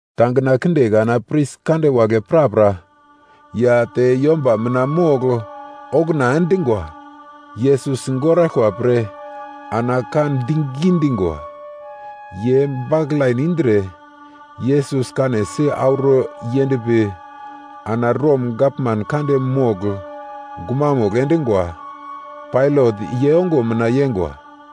Tangina kinde kana pris kande wagle prapra ya te yomba mina mogl okuna endingwa Yesus sigoraglkwa pre ana ka digi dingwa. Ye baklain indre Yesus kanesi auro yendpi ana Rom gavman kande mogl gumamugl endungwa, Pailat ye ongo mina yeingwa.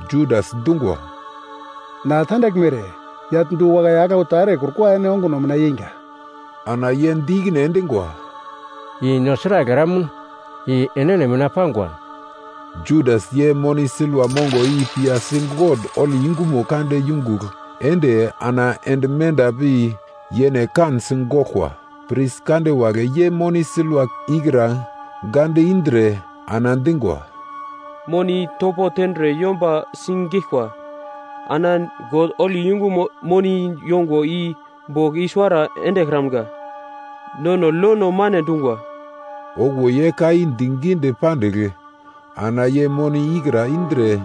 Judas dungwa, “Na tandaglme ere, yagl du-wakai aglau ta erekrukwa ene onguno mina yeingwa.” Ana ye di ikine endingwa, “I no sragl eramun? I enene mina pangwa.” Judas ye moni silva mongo i piyasi God holi yungumo kande yungugl ende ana ende menda pi yene kansi goglkwa. Pris kande wagle ye moni silva ikra gande indre ana dingwa, “Moni i topo tendre yomba sigeglkwa. Ana God holi yungumo moni yongwa i bogl i-suwara endekramga. Nono lono mane dungwa.” Okuwo ye ka i digidi pandigl ana ye moni ikra indre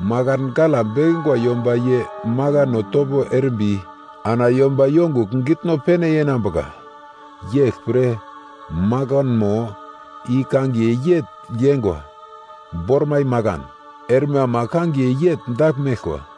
makan gala bekingwa yomba ye makano topo erimbi ana yomba yongugl gitno pene yenambuka. Yeglpre makanmo i kangiye yegl yeingwa, ‘Bormai Makan’ erme ama kangiye yegl dagl meglkwa.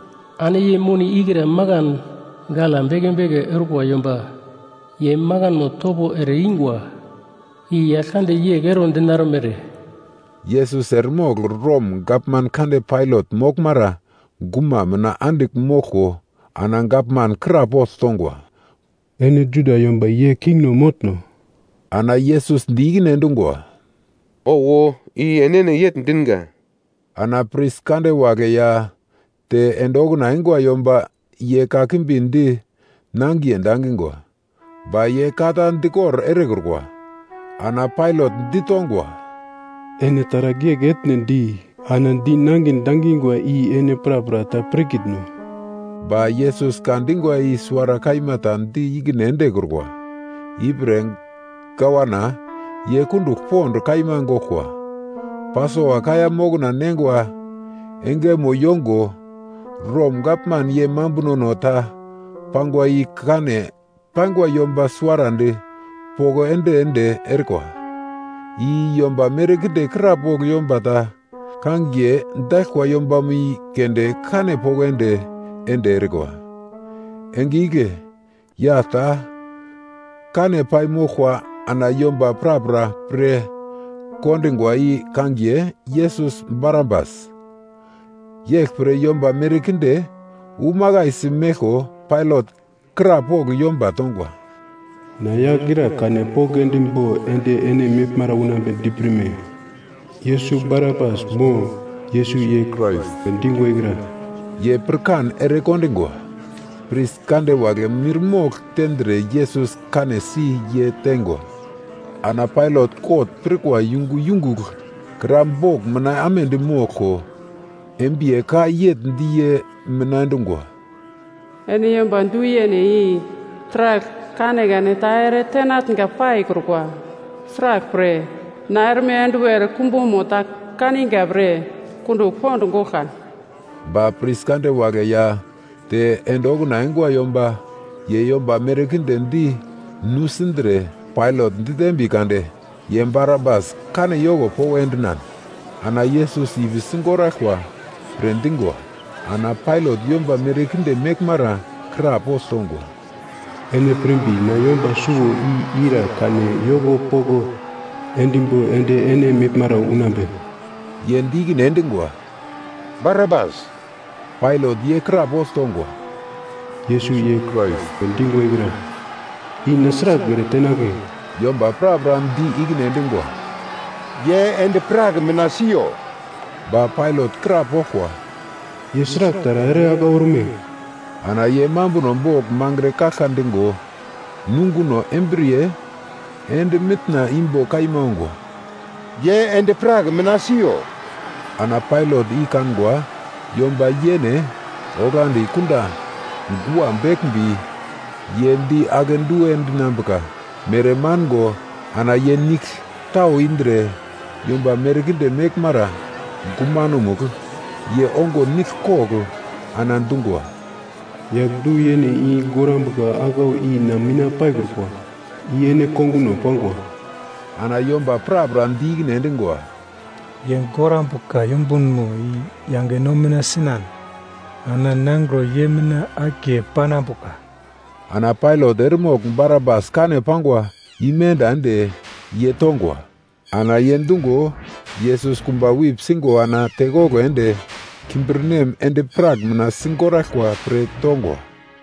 Ana ye moni ikra makan gala beke beke orkwa yomba ye makanmo topo ere ingwa, i Yaglkande yegl ero dinarmere.” Yesus eremogl Rom gavman kande Pailat moglmara guma mina andigl moglko ana gavman krapogl tongwa, “Ene Juda yomba ye kingno motno?” Ana Yesus di ikine endungwa, “Owo, i enene yegl dinga.” Ana pris kande wagle ya te ende okuna eingwa yomba ye kakimbi di nangiye dangingwa. Ba ye ka ta dikor erekrukwa. Ana Pailat ditongwa, “Ene taragl yegl etne di ana di nangin dangingwa i ene prapra ta pirkitno?” Ba Yesus ka dingwa i suwara kaima ta di ikine endekrukwa, ipre gavana ye kundugl pond kaima goglkwa. Pasova kaiya mokna neingwa engemo yongo Rom gavman ye mambunono ta pangwa i kane paingwa yomba suwarandi poko ende-ende erikwa. I yomba merkinde krapogl yomba ta kangiye daglkwa yombamo i keunde kane poko ende-ende erikwa. Enge igle yagl ta kane pai moglkwa ana yomba prapra pirkondingwa i kangiye, Yesus Barabas. Yeglpre yomba merkinde umakaisi meglko Pailat krapogl yomba tongwa, “Na yagl ira kane poko endimbo ende ene meglmara unambedi pirme? Yesus Barabas mo, Yesus ye Krais we dingwa ikra?” Ye pirkan ere kondingwa. Pris kande wagle mirmogl tendre Yesus kanesi ye teingwa. Ana Pailat kot pirkwa yungu yungugl kra bogl mina amedi moglko, embiye ka yegl di ye mina endungwa, “Ene yomba du-yene i taragl kanekane ta ere tenatnga paikrukwa. Sraglpre, na erme enduwer kumbumo ta kaninga pre kundugl pond goglka.” Ba pris kande wagle ya te ende okuna eingwa yomba ye yomba merkinde di nusindre Pailat ditembi kade ye Barabas kane yoko poko endinan ana Yesus ipi sigoraglkwa pre dingwa. Ana Pailat yomba merkinde meglmara krapogl tongwa, “Ene pirmbi na yomba suwo i ira kane yoko poko endimbo ende ene meglmara unambe?” Ye di ikine endingwa, “Barabas.” Pailat ye krapogl tongwa, “Yesus ye Krais we dingwa, i na sragl ere tenagle?” Yomba prapra di ikine endingwa, “Ye endi-prak mina siyo.” Ba Pailat krapoglkwa, “Ye sragl taragl ere aglau orme?” Ana ye mambuno bogl mangre kaglka digo, nunguno embriye ende mitna imbo kaima ongwa, “Ye endi-prak mina siyo!” Ana Pailat i kangwa yomba ye yene oglagldi kunda gua beglmbi, ye di akedu endinambuka mere mango ana ye nigl tau indre yomba merkinde meglmara gumanomugl ye ongo nigl kogl ana dungwa, “Yagl du-yene i gorambuka aglau i na mina paikrukwa. I ene konguno pangwa!” Ana yomba prapra di ikine endingwa, “Ye gorambuka yumbunmo i yange no mina sinan ana nangro ye mina akiye panambuka!” Ana Pailat eremogl Barabas kane pangwa imenda ende ye tongwa, ana ye dungo Yesus kumba wip singo ana tekoglo ende kimbirnem endi-prak mina sigoraglkwa pre tongwa.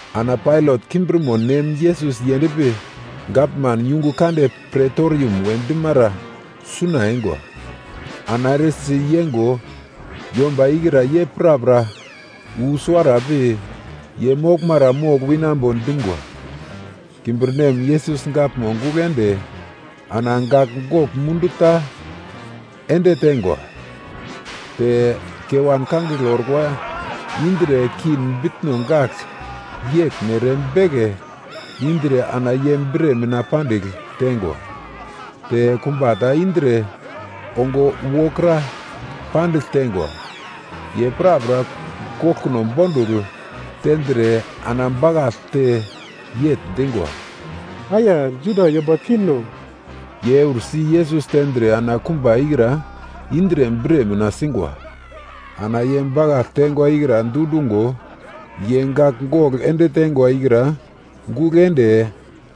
Ana Pailat kimbirmo nem Yesus yendpi gavman yungu kande Pretorim we dimara suna eingwa, ana eresi yeingwa yomba ikra ye prapra wu suwara pi ye moglmara mogl winambo dingwa. Kimbirnem Yesus gaglmo gugl ende ana gagl gogl mundu ta ende teingwa. Te kewan kangigle orkwa indre king bitno gagl yeglmere beke indre ana ye bre mina pandigl tengwa. Te kumba ta indre ongo wokra pandigl teingwa. Ye prapra goglkono bondugl tendre ana bakaglte yegl dingwa, “Aya, Juda yomba kingno.” Ye eursi Yesus tendre ana kumba ikra indre bre mina singwa. Ana ye bakagl teingwa ikra dundungo ye gagl gogl ende teingwa ikra gugl ende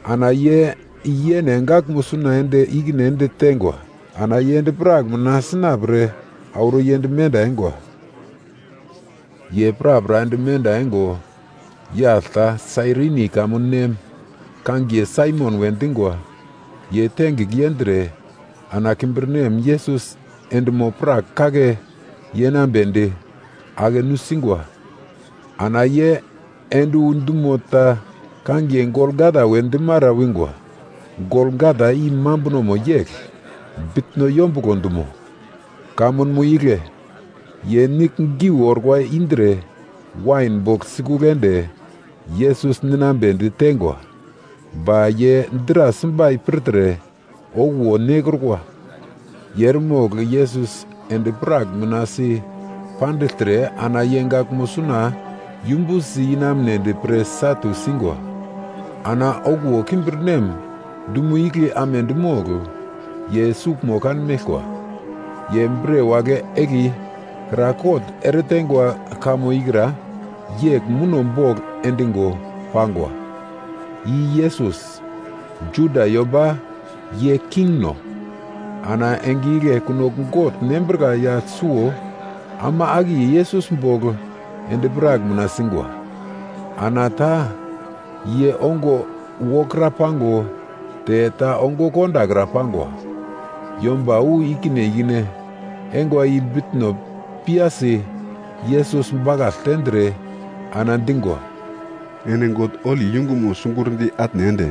ana ye yene gaglmo suna ende ikine ende teingwa. Ana ye endi-prak mina sina pre auro yend menda eingwa. Ye prapra ende menda eingo, yagl ta Sairini kamun nem, kangiye Saimon we dingwa. Ye tengigl yendre ana kimbirnem Yesus endimo-prak kake yenambedi ake nusingwa. Ana ye ende wu dumo ta kangiye Golgata we dimara wingwa. (Golgata i mambunomo yegl, bitno yombuglo dumo.) Kamunmo igle ye nigl geu orkwa indre wain bogl sikugl ende, Yesus ninambedi teingwa. Ba ye dra simbai pirtre okuwo nekrukwa. Ye eremogl Yesus endi-prak mina si pandigltre ana ye gaglmo suna yumbusi inamunedi pre satu singwa. Ana okuwo kimbirnem dumo igle amedi mogl, ye suglmo kanmeglkwa. Ye bre wagle egli kra kot ereteingwa kamo ikra, yegl muno bogl endingo pangwa: I YESUS, JUDA YOMBA YE KINGNO. Ana enge igle kunogl gogl nembrika yagl suwo ama akiye Yesus bogl endi-prak mina singwa. Ana ta ye ongo wokra pango te ta ongo kondakra pangwa. Yomba wu ikine ikine eingwa i bitno piyasi Yesus bakagl tendre, ana dingwa, “Ene God holi yungumo sigurndi atne ende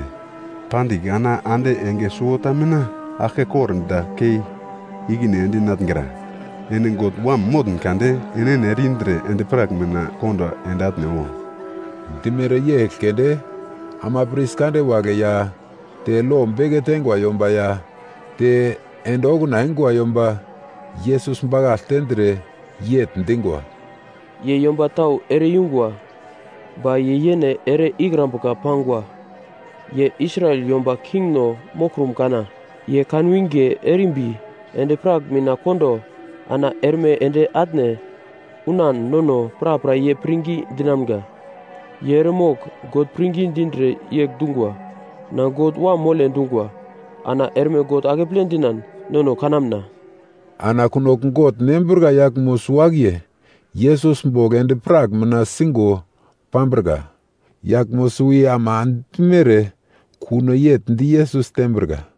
pandigl ana ande enge suwota mina aglke kordagl kei ikine endinatngra. Ene God Wam motn kade, enene ere-indre endi-prak mina kondo ende atne wo!” Dimere yegl keunde ama pris kande wagle ya te lo beke teingwa yomba ya te ende okuna eingwa yomba, Yesus bakagl tendre yegl dingwa, “Ye yomba tau ere-yungwa ba ye yene ere-ikrambuka pangwa! Ye Israel yomba Kingno moglkrum kana! Ye kanwinge erimbi endi-prak mina kondo ana erme ende atne unan nono prapra ye pirngi dinamga. Ye eremogl God pirngi dindre yegl dungwa, ‘Na God Wam mole,’ dungwa, ana erme God akeple dinan nono kanamna.” Ana kunogl gogl nembrika yaglmo suwo-akiye Yesus bogl endi-prak mina singo pambrika. Yaglmo suwo i ama dimere kuno yegl di Yesus tembrika.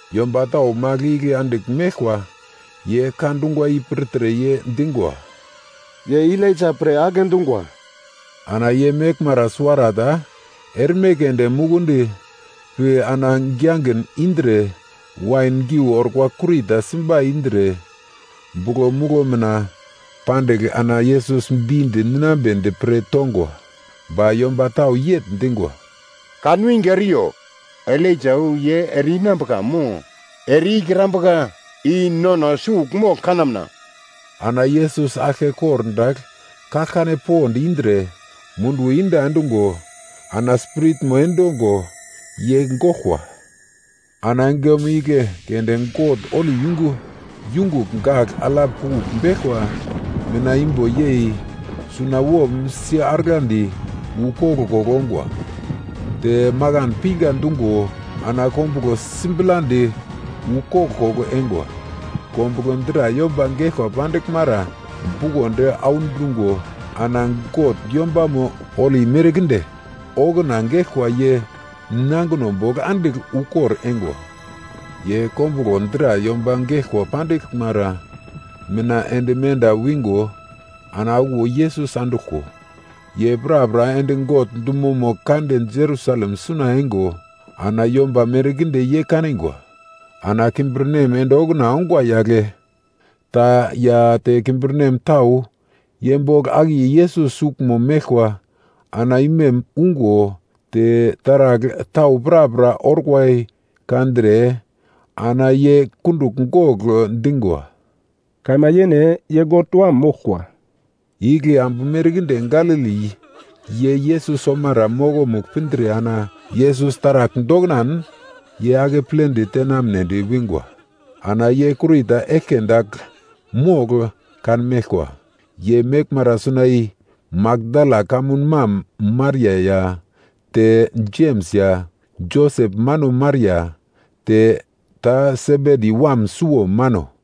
Yomba tau magl igle andigl meglkwa ye ka dungwa i pirtre ye dingwa, “Ye Elaija pre agle dungwa.” Ana ye meglmara suwarata erme keunde mukundi pi ana giyagin indre, wain geu orkwa kurita simbai indre, buglo muglo mina pandigl ana Yesus bindi ninambedi pre tongwa. Ba yomba tau yegl dingwa, “Kanwinge eriyo, Elaija wu ye ere-inambuka mo ere-ikrambuka, i nono sugl mogl kanamna.” Ana Yesus aglke kordagl kaglkane pond indre, munduwo iyenda endungo ana spiritmo endongo ye goglkwa. Ana engemo igle keunde God holi yungu yungugl gagl alap kugl beglkwa mitna imbo yei sunawom si-aragladi wu koglkoglo ongwa. Te makan pinga dungo ana kombuglo sibladi wu koglkoglo eingwa. Kombuglo dra yomba geglko pandiglmara bukondi audungo ana God yombamo holi merkinde okuna geglkwa ye nangino bogl andigl ukor eingwa. Ye kombuglo dra yomba geglko pandiglmara mina ende menda wingo ana okuwo Yesus anduglko, ye prapra ende God dumomo kande Jerusalem suna eingo ana yomba merkinde ye kanigwa. Ana kimbirnem ende okuna ongwa yagle ta ya te kimbirnem tau ye bogl akiye Yesus suglmo meglkwa ana imem ungo, te taragl tau prapra orkwa i kandre ana ye kundugl gogl dingwa, “Kaima yene, ye God Wam moglkwa!” Igle ambu merkinde Galili ye Yesus omara mokomugl pindre ana Yesus taragl doknan ye akepledi tenamnedi wingwa. Ana ye kurita eglke dagl mogl kanmeglkwa. Ye meglmara suna i Makdala kamun mam Maria ya te Jems ya Josep mano Maria, te ta Sebedi wam suwo mano.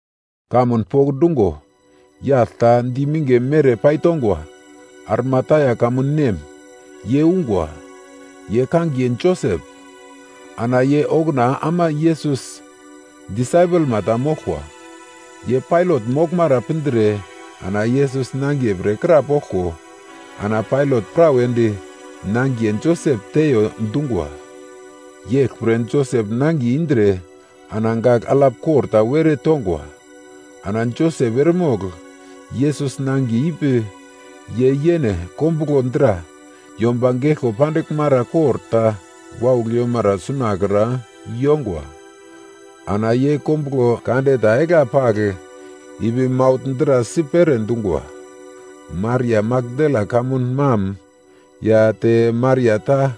Kamun pokndungo, yagl ta di minge mere paitongwa Arimatia kamun nem, ye ungwa. Ye kangiye Josep, ana ye okuna ama Yesus disaipelma ta moglkwa. Ye Pailat moglmara pindre ana Yesus nangiye pre krapoglko ana Pailat prawedi nangiye Josep teiyo dungwa. Yeglpre Josep nangiye indre ana gagl alap kor ta were tongwa. Ana Josep eremogl Yesus nangiye ipi ye yene kombuglo dra yomba geglko pandiglmara kor ta waugl yomara sunakra yongwa. Ana ye kombuglo kande ta egla pagl ipi maugl dra si pere dungwa. Maria Makdala kamun mam ya te Maria ta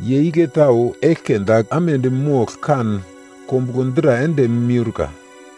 ye igle tau eglke dagl amedi mogl kan kombuglo dra ende miurka.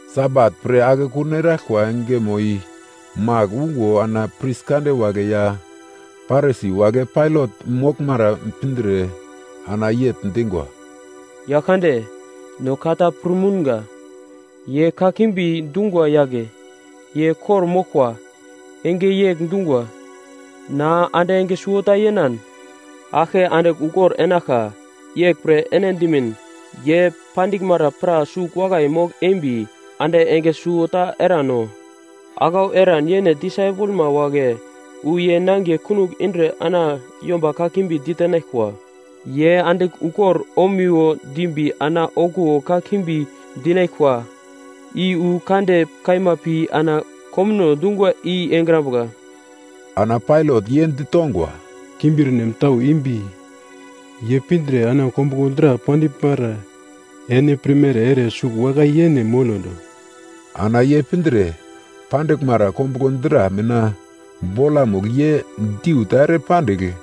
Sabat pre akekun eraglkwa engemo i magl ungo ana pris kande wagle ya Parisi wagle Pailat moglmara pindre, ana yegl dingwa, “Yagl kande, no ka ta pir mounga. Ye kakimbi dungwa yagle, ye kor-moglkwa enge yegl dungwa, ‘Na ande enge suwota yenan aglke andigl ukor enaglka.’ Yeglpre ene dimin ye pandiglmara pra sugl wakai mogl-embi, ande enge suwota erano. Aglau eran yene disaipelma wagle wu ye nangiye kunogl indre ana yomba kakimbi ditenaglkwa. Ye andigl ukor omiwo dimbi ana okuwo kakimbi dinaglkwa i wu kande kaima pi ana komuno dungwa i engrambuka.” Ana Pailat ye ditongwa, “Kimbirnem tau imbi, ye pindre ana kombuglo dra pandiglmara ene pirmere ere sugl wakai yene molondo.” Ana ye pindre pandiglmara kombuglo dra mina bolamugl ye diu ta ere pandigl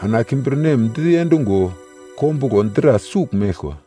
ana kimbirnem diendingo kombuglo dra sugl meglkwa.